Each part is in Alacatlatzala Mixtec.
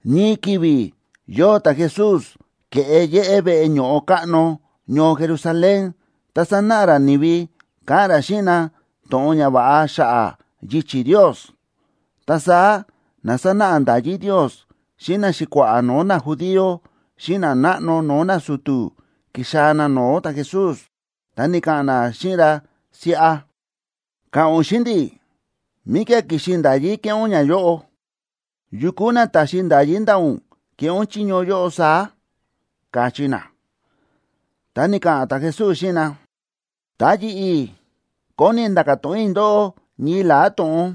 Ñii ki̱vi̱ yóo ta̱Jesús ke̱ꞌe yéꞌé veꞌe ño̱ꞌo káꞌno ñoo Jerusalén, ta sánáꞌa ra ni̱vi, káꞌa̱n ra xíꞌin na to̱ꞌon ñava̱ꞌa xa̱ꞌa̱ yichi̱ Ndios. Ta saá na sánáꞌa nda̱yí Ndios xíꞌin naxi̱kua̱ꞌa̱ no̱o̱ najudío xíꞌin nanáꞌno no̱o̱ nasu̱tu̱ ki̱xaa̱ na no̱o̱ ta̱Jesús, ta ni̱ka̱ꞌa̱n na xíꞌin ra siꞌa: ―Ka̱ꞌa̱n ún xíꞌin ndi̱, ¿míkía̱ ki̱xi nda̱yí kéꞌé ún ñayóꞌo? ¿Yu kúu na ta̱xi nda̱yí ndaꞌa̱ ún keꞌé ún chiño yóꞌo saá? ―káchí na. Ta ni̱ka̱ꞌa̱n ta̱Jesús xíꞌin na: ―Ta yi̱ꞌi̱ kóni i̱ nda̱ka̱ to̱ꞌon i̱ ndóꞌó ñii la̱á to̱ꞌon,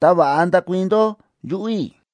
ta va̱ꞌa ndakuii̱n ndó yuꞌu̱ i̱.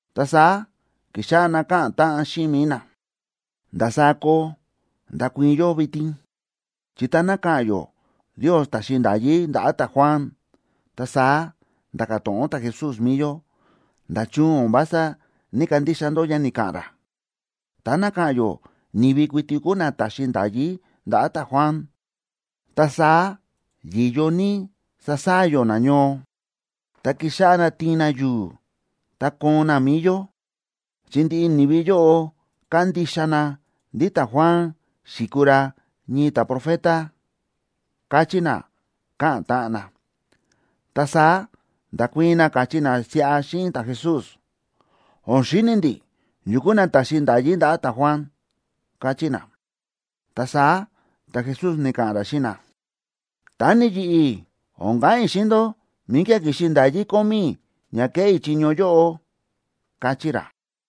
Ta saá ki̱xáꞌá na káꞌa̱n táꞌan xíꞌin mi̱i na: ―¿Ndasaá koo ndakuii̱n yó vitin? Chi táná ka̱ꞌa̱n yó Ndios ta̱xi nda̱yí ndaꞌa̱ ta̱Juan, ta saá nda̱ka̱ to̱ꞌon ta̱Jesús mi̱i yó: “¿Nda̱chun o̱n vása ní‑kandixa ndó ña ni̱ka̱ꞌa̱n ra?” Táná ka̱ꞌa̱n yó ni̱vi kuiti kúu na ta̱xi nda̱yí ndaꞌa̱ ta̱Juan, ta saá yi̱yo ní sasaa̱ yó nañoo, ta kixáꞌá na tiin na yu̱u̱, ta koon na mi̱i yó, chi ndiꞌi ni̱vi yóꞌo kándixa na ndí ta̱Juan xi̱kuu ra ñii ta̱profeta ―káchí na, káꞌa̱n táꞌan na. Ta saá nda̱kuii̱n na, káchí na siꞌa xíꞌin ta̱Jesús: ―O̱n xíni̱ ndi̱ yu kúu na ta̱xi nda̱yí ndaꞌa̱ ta̱Juan ―káchí na. Ta saá ta̱Jesús ni̱ka̱ꞌa̱n ra xíꞌin na: ―Ta ni yi̱ꞌi̱, o̱n ka̱ꞌa̱n i̱ xíꞌin ndó míkía̱ ki̱xi nda̱yí kómí i̱ ña kéꞌé i̱ chiño yóꞌo ―káchí ra.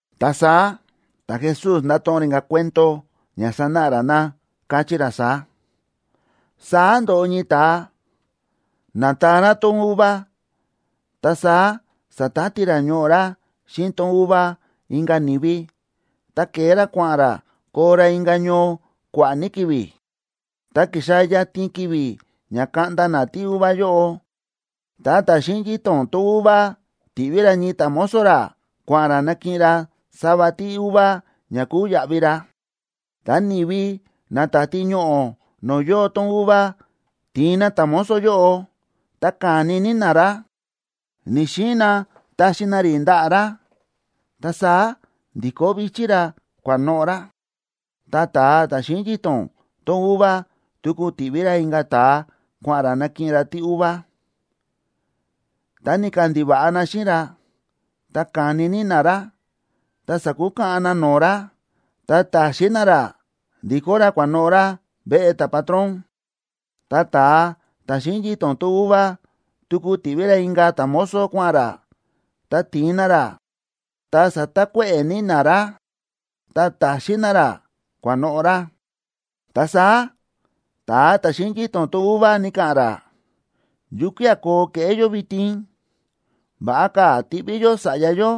Ta saá ta̱Jesús nda̱to̱ꞌon ra inka̱ cuento ña sanáꞌa ra na, káchí ra saá: ―Saá ndo̱ꞌo ñii ta̱a, na̱taan ra tón uva, ta saá sa̱tati ra ñoꞌo̱ ra xíꞌin tón uva inka̱ ni̱vi, ta ke̱e ra kua̱ꞌa̱n ra koo ra inka̱ ñoo kua̱ꞌa̱ ní ki̱vi̱. Ta ki̱xaa̱ yatin ki̱vi̱ ña kaꞌnda na tíuva yóꞌo, ta ta̱ xíꞌin yito̱n tón uva ti̱ꞌví ra ñii ta̱mozo ra kua̱ꞌa̱n ra nakiꞌin ra sava tíuva ña kuu yaꞌvi ra. Ta ni̱vi na táti ñoꞌo̱ no̱o̱ yóo tón uva ti̱in na ta̱mozo yóꞌo, ta ka̱ni ní na ra, ni̱‑xiin na taxi na rí ndaꞌa̱ ra, ta saá ndi̱kó vi̱chí ra kua̱noꞌo̱ ra. Ta ta̱a ta̱ xíꞌin yito̱n tón uva tuku ti̱ꞌví ra inka̱ ta̱a kua̱ꞌa̱n ra nakiꞌin ra tíuva. Ta ni̱kandiva̱ꞌa na xíꞌin ra, ta ka̱ni ní na ra, ta sa̱kukaꞌan na no̱o̱ ra, ta ta̱xin na ra ndikó ra kua̱noꞌo̱ ra veꞌe ta̱patrón. Ta ta̱a ta̱ xíꞌin yito̱n tón uva tuku ti̱ꞌví ra inka̱ ta̱mozo kua̱ꞌa̱n ra, ta ti̱in na ra, ta sa̱takuéꞌe̱ ní na ra, ta ta̱xin na ra, kua̱noꞌo̱ ra. ’Ta saá ta̱a ta̱ xíꞌin yito̱n tón uva ni̱ka̱ꞌa̱n ra: “¿Yukía̱ koo keꞌé yó vitin? Va̱ꞌa ka̱ tiꞌví yó sa̱ꞌya yó,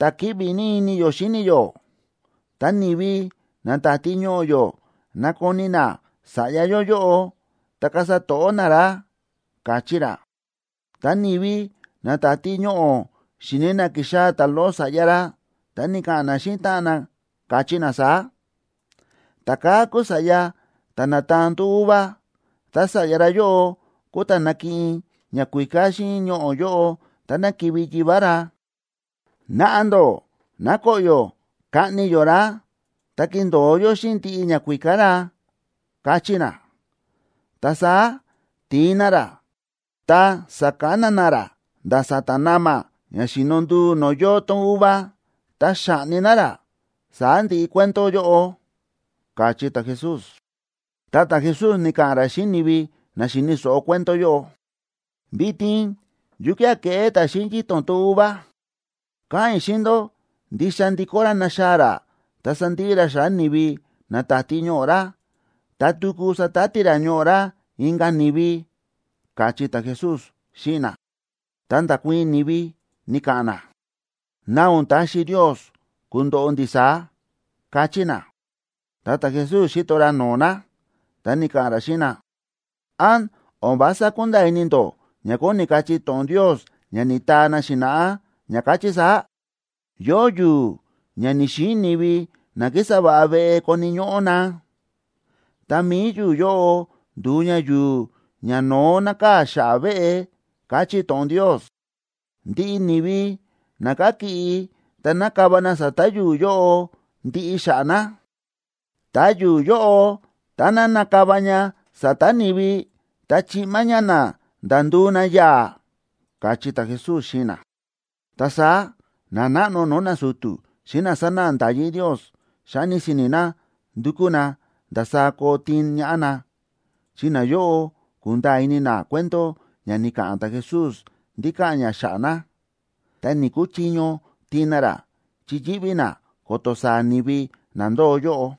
ta̱ kíꞌvi ní ini yó xíni yó. Tá ni̱vi na táti ñoꞌo̱ yó nakoni na sa̱ꞌya yó yóꞌo, ta kasa to̱ꞌó na ra”, káchí ra. Ta ni̱vi na táti ñoꞌo̱ xi̱ni̱ na kíxaa̱ ta̱loꞌo sa̱ꞌya ra, ta ni̱ka̱ꞌa̱n na xíꞌin táꞌan na, káchí na saá: “Ta̱kaa̱ kúu sa̱ꞌya ta̱ na̱taan tón uva, ta sa̱ꞌya ra yóꞌo kúu ta̱ nakiꞌin ñakuíká xíꞌin ñoꞌo̱ yóꞌo táná kivi̱ yivá ra. Naꞌa ndó ná koꞌyo̱ kaꞌni yó ra, ta kindo̱o yó xíꞌin ndiꞌi ñakuíká ra”, káchí na. Ta saá ti̱in na ra, ta sa̱kana na ra nda̱ sa̱ta̱ na̱ma̱ ña xíno nduu no̱o̱ yóo tón uva, ta xa̱ꞌni na ra. Saá ndi̱ꞌi cuento yóꞌo ―káchí ta̱Jesús. Ta ta̱Jesús ni̱ka̱ꞌa̱n ra xíꞌin ni̱vi na xi̱ni̱ so̱ꞌo cuento yóꞌo: ―¿Vitin yukía̱ keꞌé ta̱ xíꞌin yito̱n tón uva? Káꞌa̱n i̱ xíꞌin ndó, ndixa ndikó ra naxaa̱ ra ta sandiꞌi ra xa̱ꞌa̱ ni̱vi na táti ñoꞌo̱ ra. Ta tuku satati ra ñoꞌo̱ ra inka̱ ni̱vi ―káchí ta̱Jesús xíꞌin na. Ta nda̱kuii̱n ni̱vi, ni̱ka̱ꞌa̱n na: ―¡Ná o̱n taxi Ndios kundoꞌo ndi̱ saá! ―káchí na. Ta ta̱Jesús xíto ra no̱o̱ na, ta ni̱ka̱ꞌa̱n ra xíꞌin na: ―¿Án o̱n vása kúnda̱a̱ ini ndó ña kóni kachí to̱ꞌon Ndios ña ni̱taa na xi̱na̱ꞌá, ña káchí saá?: Yóo yu̱u̱ ña ni̱‑xiin ni̱vi na kísa va̱ꞌa veꞌe koni̱ ñóꞌó na, ta mi̱i yu̱u̱ yóꞌo ndu̱u ña yu̱u̱ ñano̱ó nákaa̱ xa̱ꞌa̱ veꞌe, káchí to̱ꞌon Ndios. Ndiꞌi ni̱vi na kakiꞌi ta nakava na sa̱ta̱ yu̱u̱ yóꞌo ndiꞌi xa̱ꞌa̱ na. Ta yu̱u̱ yóꞌo, táná nakava ña sa̱ta̱ ni̱vi, ta chiꞌma ña na nda̱ nduu na yaa̱ ―káchí ta̱Jesús xíꞌin na. Ta saá nanáꞌno no̱o̱ nasu̱tu̱ xíꞌin na sánáꞌa nda̱yí Ndios xa̱ni si̱ni̱ na ndu̱kú na ndasaá koo tiin ñaꞌá na, chi nayóꞌo ku̱nda̱a̱ ini na cuento ña ni̱ka̱ꞌa̱n ta̱Jesús ndí káꞌa̱n ña xa̱ꞌa̱ na. Ta ni̱‑kuchiño tiin na ra, chi yíꞌví na ko̱to̱ saa̱ ni̱vi na ndóo yóꞌo.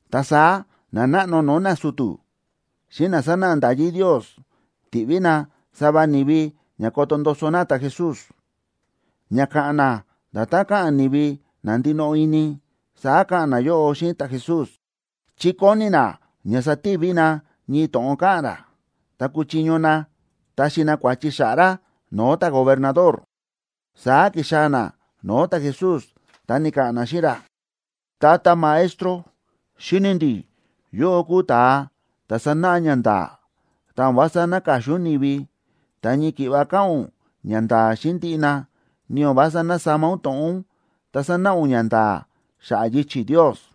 Ta saá nanáꞌno no̱o̱ nasu̱tu̱ xíꞌin na sánáꞌa nda̱yí Ndios ti̱ꞌví na sava ni̱vi ña koto ndoso na ta̱Jesús. Ña káꞌa̱n na nda̱tán káꞌa̱n ni̱vi na ndinoꞌo ini, saá ka̱ꞌa̱n nayóꞌo xíꞌin ta̱Jesús, chi kóni na ña sativi na ñii to̱ꞌon káꞌa̱n ra, ta kuchiño na taxi na kua̱chi xa̱ꞌa̱ ra no̱o̱ ta̱gobernador. Saá ki̱xaa̱ na no̱o̱ ta̱Jesús, ta ni̱ka̱ꞌa̱n na xíꞌin ra: ―Tata Maestro, xíni̱ ndi̱ yóꞌó kúu ún ta̱a ta̱ sánáꞌa ñanda̱a̱. Ta o̱n vása náka̱xin ún ni̱vi, ta ñii ki̱ꞌva káꞌa̱n ún ñanda̱a̱ xíꞌin ndiꞌi na, ni o̱n vása násama ún to̱ꞌon ún, ta sánáꞌa ún ñanda̱a̱ xa̱ꞌa̱ yichi̱ Ndios.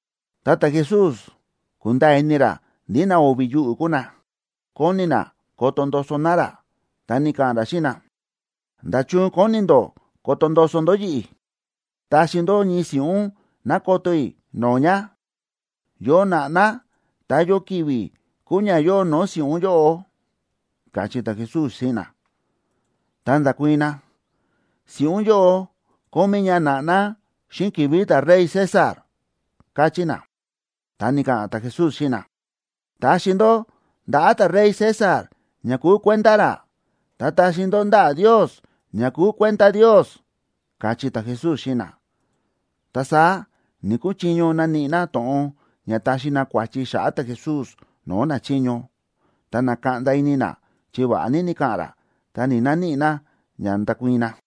Ta ta̱Jesús kúnda̱a̱ ini ra ndí na o̱vi̱ yuꞌu̱ kúu na, kóni na koto ndoso na ra, ta ni̱ka̱ꞌa̱n ra xíꞌin na: ―¿Nda̱chun kóni ndó koto ndoso ndó yi̱ꞌi̱? Taxi ndó ñii si̱ꞌún ná koto i̱ no̱o̱ ña. ¿Yo na̱ꞌná, ta yo ki̱vi̱ kúu ña yóo no̱o̱ si̱ꞌún yóꞌo? ―káchí ta̱Jesús xíꞌin na. Ta nda̱kuii̱n na: ―Si̱ꞌún yóꞌo kómí ña na̱ꞌná xíꞌin ki̱vi̱ ta̱rey César ―káchí na. Ta ni̱ka̱ꞌa̱n ta̱Jesús xíꞌin na: ―Taxi ndó ndaꞌa̱ ta̱rey César ña kúu kuenda ra, ta taxi ndó ndaꞌa̱ Ndios ña kúu kuenda Ndios ―káchí ta̱Jesús xíꞌin na. Ta saá ni̱‑kuchiño naníꞌi na to̱ꞌon ña taxi na kua̱chi xa̱ꞌa̱ ta̱Jesús no̱o̱ nachiño. Ta na̱kaꞌnda ini na chi va̱ꞌa ní ni̱ka̱ꞌa̱n ra, ta ni̱‑naníꞌi na ña ndakuii̱n na.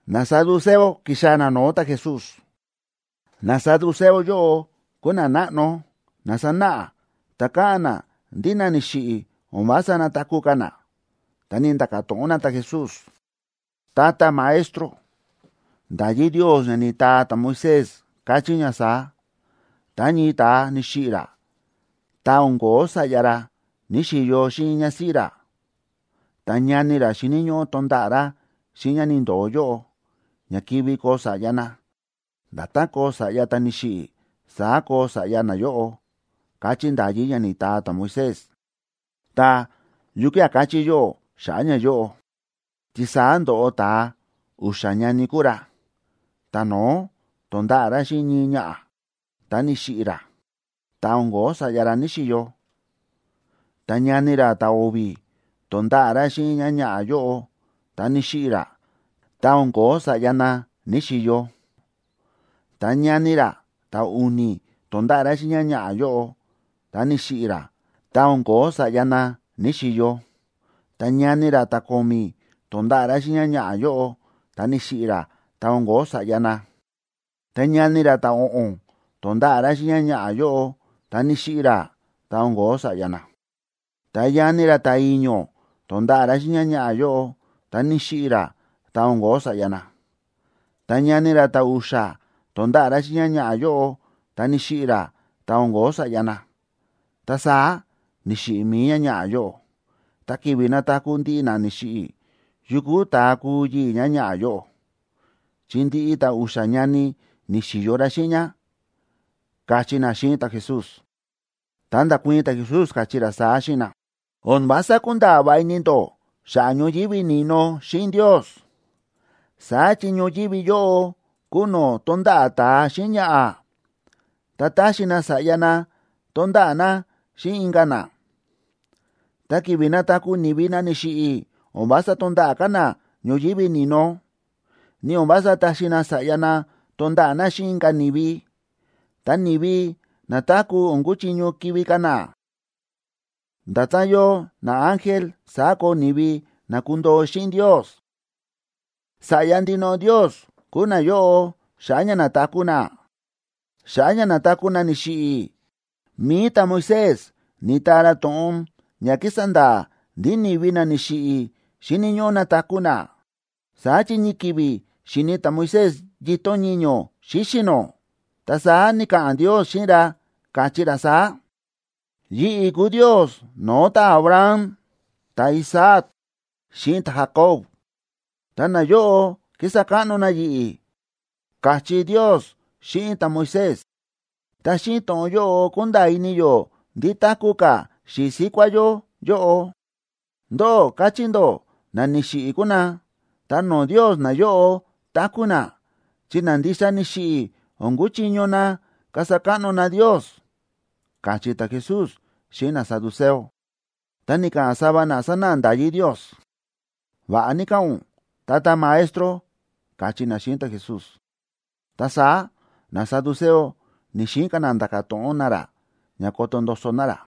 Nasaduceo ki̱xaa̱ na no̱o̱ ta̱Jesús. Nasaduceo yóꞌo kúu na nanáꞌno na sánáꞌa ta káꞌa̱n na ndí na ni̱xiꞌi̱ o̱n vása nataku̱ ka̱ na. Ta ni̱nda̱ka̱ to̱ꞌon na ta̱Jesús: ―Tata Maestro, nda̱yí Ndios ña ni̱taa ta̱Moisés káchí ña saá: “Tá ñii ta̱a ni̱xiꞌi̱ ra, ta o̱n ko̱ó sa̱ꞌya ra ní‑xiyo xíꞌin ñásíꞌí ra, ta ñani ra xíni̱ ñóꞌó tonda̱ꞌa̱ ra xíꞌin ñá ni̱ndo̱o yóꞌo, ña kivi koo sa̱ꞌya na. Nda̱tán koo sa̱ꞌya ta̱ ni̱xiꞌi̱, saá koo sa̱ꞌya nayóꞌo”, káchí nda̱yí ña ni̱taa ta̱Moisés. Ta, ¿yukía̱ káchí yóꞌó xa̱ꞌa̱ ñayóꞌo? Chi saá ndo̱ꞌo ta̱a, u̱xa̱ ñani kúu ra. Ta̱no̱ó to̱nda̱ꞌa̱ ra xíꞌin ñii ñaꞌa̱, ta ni̱xiꞌi̱ ra, ta o̱n ko̱ó sa̱ꞌya ra ní‑xiyo. Ta ñani ra ta̱o̱vi̱ to̱nda̱ꞌa̱ ra xíꞌin ñáñaꞌa̱ yóꞌo, ta ni̱xiꞌi̱ ra, ta o̱n ko̱ó sa̱ꞌya na ní‑xiyo. Ta ñani ra ta̱u̱ni̱ to̱nda̱ꞌa̱ ra xíꞌin ñáñaꞌa̱ yóꞌo, ta ni̱xiꞌi̱ ra, ta o̱n ko̱ó sa̱ꞌya na ní‑xiyo. Ta ñani ra ta̱ko̱mi̱ to̱nda̱ꞌa̱ ra xíꞌin ñáñaꞌa̱ yóꞌo, ta ni̱xiꞌi̱ ra, ta o̱n ko̱ó sa̱ꞌya na. Ta ñani ra ta̱o̱ꞌo̱n to̱nda̱ꞌa̱ ra xíꞌin ñáñaꞌa̱ yóꞌo, ta ni̱xiꞌi̱ ra, ta o̱n ko̱ó sa̱ꞌya na. Ta ñani ra ta̱i̱ño̱ to̱nda̱ꞌa̱ ra xíꞌin ñáñaꞌa̱ yóꞌo, ta ni̱xiꞌi̱ ra, ta o̱n ko̱ó sa̱ꞌya na. Ta ñani ra ta̱u̱xa̱ to̱nda̱ꞌa̱ ra xíꞌin ñáñaꞌa̱ yóꞌo, ta ni̱xiꞌi̱ ra, ta o̱n ko̱ó sa̱ꞌya na. Ta saá ni̱xiꞌi̱ mi̱i ñáñaꞌa̱ yóꞌo. Ta ki̱vi̱ nataku̱ ndiꞌi na ni̱xiꞌi̱, ¿yukú ta̱a kuu yii̱ ñáñaꞌa̱ yóꞌo?, chi ndiꞌi ta̱a u̱xa̱ ñani ni̱xi̱yo ra xíꞌin ñá ―káchí na xíꞌin ta̱Jesús. Ta nda̱kuii̱n ta̱Jesús, káchí ra saá xíꞌin na: ―O̱n vása kúnda̱a̱ va̱ꞌa ini ndó xa̱ꞌa̱ ñoyívi ni̱no xíꞌin Ndios. Saá chi ñoyívi yóꞌo kúu no̱o̱ tónda̱ꞌa̱ ta̱a xíꞌin ñaꞌa̱, ta táxi na sa̱ꞌya na tonda̱ꞌa̱ na xíꞌin inka̱ na. Ta ki̱vi̱ nataku̱ ni̱vi na ni̱xiꞌi̱, o̱n vása tonda̱ꞌa̱ ka̱ na ñoyívi ni̱no, ni o̱n vása taxi na sa̱ꞌya na tonda̱ꞌa̱ na xíꞌin inka̱ ni̱vi. Ta ni̱vi na̱taku̱ o̱n kuchiño kivi̱ ka̱ na, ta nda̱tán yóo naángel saá koo ni̱vi na kundoo xíꞌin Ndios. Sa̱ꞌya ndinoꞌo Ndios kuu nayóꞌo, xa̱ꞌa̱ ña nataku̱ na. Xa̱ꞌa̱ ña nataku̱ na ni̱xiꞌi̱, mi̱i ta̱Moisés ni̱taa ra to̱ꞌon ña kísa nda̱a̱ ndí ni̱vi na ni̱xiꞌi̱ xíni̱ ñóꞌó nataku̱ na. Saá chi ñii ki̱vi̱ xi̱ni̱ ta̱Moisés yito̱n ñiño̱ xíxi̱ nó, ta saá ni̱ka̱ꞌa̱n Ndios xíꞌin ra, káchí ra saá: “Yi̱ꞌi̱ kúu Ndios no̱o̱ ta̱Abraham, ta̱Isaac, xíꞌin ta̱Jacob, ta nayóꞌo kísa káꞌno na yi̱ꞌi̱”, káchí Ndios xíꞌin ta̱Moisés. Ta xíꞌin to̱ꞌon yóꞌo kúnda̱a̱ ini yó ndí táku̱ ka̱ xi̱i̱ síkuá yó yóꞌo. Ndóꞌó káchí ndó na ni̱xiꞌi̱ kúu na, ta no̱o̱ Ndios nayóꞌo táku̱ na, chi na ndixa ni̱xiꞌi̱ o̱n kuchiño na kasa káꞌno na Ndios ―káchí ta̱Jesús xíꞌin nasaduceo. Ta ni̱ka̱ꞌa̱n sava na sánáꞌa nda̱yí Ndios: ―Va̱ꞌa ní káꞌa̱n ún, Tata Maestro ―káchí na xíꞌin ta̱Jesús. Ta saá nasaduceo ni̱‑xiin ka̱ na nda̱ka̱ to̱ꞌon na ra ña koto ndoso na ra.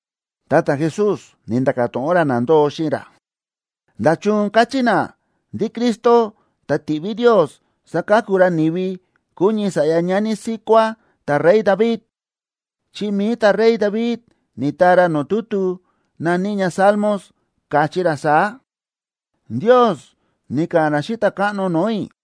Ta ta̱Jesús ni̱nda̱ka̱ to̱ꞌon ra na ndóo xíꞌin ra: ―¿Nda̱chun káchí na ndí Cristo, ta̱ tiꞌví Ndios saka̱ku ra ni̱vi, kuu ñii sa̱ꞌya ñani síkuá ta̱rey David? Chi mi̱i ta̱rey David ni̱taa ra no̱o̱ tutu na̱ní ña Salmos, káchí ra saá: Ndios ni̱ka̱ꞌa̱n ra xíꞌin Ta̱káꞌno no̱o̱ i̱: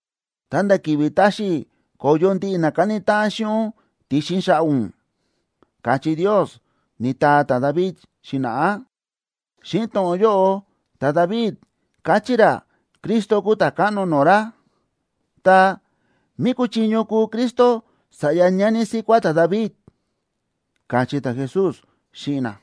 ta̱nda̱ ki̱vi̱ taxi i̱ ko̱yo ndiꞌi na káni táꞌan xíꞌin ún ti̱xin xa̱ꞌa̱ ún”, káchí Ndios, ni̱taa ta̱David xi̱na̱ꞌá. Xíꞌin to̱ꞌon yóꞌo ta̱David káchí ra Cristo kúu Ta̱káꞌno no̱o̱ ra. Ta, ¿mí kúchiño kúu Cristo sa̱ꞌya ñani síkuá ta̱David? ―káchí ta̱Jesús xíꞌin na.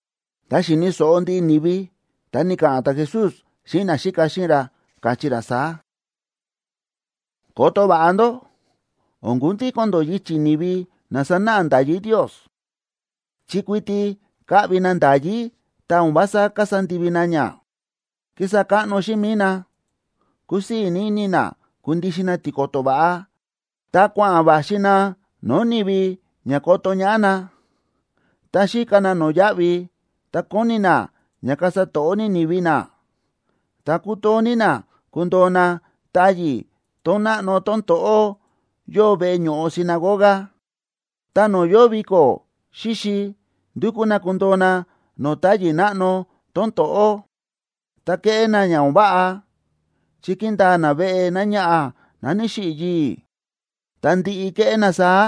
Tá xíni̱ so̱ꞌo ndiꞌi ni̱vi, ta ni̱ka̱ꞌa̱n ta̱Jesús xíꞌin naxíka xíꞌin ra, káchí ra saá: ―Koto va̱ꞌa ndó o̱n kundíko̱n ndó yichi̱ ni̱vi na sánáꞌa nda̱yí Ndios, chi kuiti káꞌvi na nda̱yí ta o̱n vása kasa ndivi na ña. Kísa káꞌno xíꞌin mi̱i na, kúsii̱ ní ini na kundixin na tiko̱to̱ va̱ꞌa, ta kua̱ꞌa̱n va̱xi na no̱o̱ ni̱vi ña koto ñaꞌá na. Ta xíka na no̱yáꞌvi, ta kóni na ña kasa to̱ꞌó ní ni̱vi na, ta kútoo ní na kundoo na táyi̱ tón náꞌno tón to̱ꞌó yóo veꞌe ño̱ꞌo sinagoga. Ta no̱o̱ yóo viko̱ xíxi, ndúkú na kundoo na no̱o̱ táyi̱ náꞌno tón to̱ꞌó. Ta kéꞌé na ña o̱n váꞌa, chi kíndaa na veꞌe náñaꞌa̱ ná ni̱xiꞌi̱ yii̱. Ta ndi̱ꞌi ke̱ꞌé na saá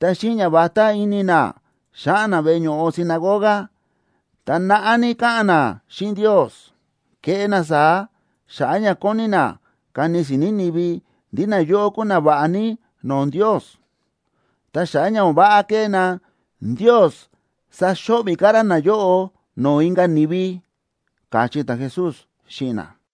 ta xíꞌin ñavatá ini na, xáꞌa̱n na veꞌe ño̱ꞌo sinagoga, ta naꞌá ní káꞌa̱n na xíꞌin Ndios. Kéꞌé na saá xa̱ꞌa̱ ña kóni na kani si̱ni̱ ni̱vi ndí nayóꞌo kúu nava̱ꞌa ní no̱o̱ Ndios. Ta xa̱ꞌa̱ ña o̱n váꞌa kéꞌé na, Ndios saxo̱ꞌvi̱ ka̱ ra nayóꞌo no̱o̱ inka̱ ni̱vi ―káchí ta̱Jesús xíꞌin na.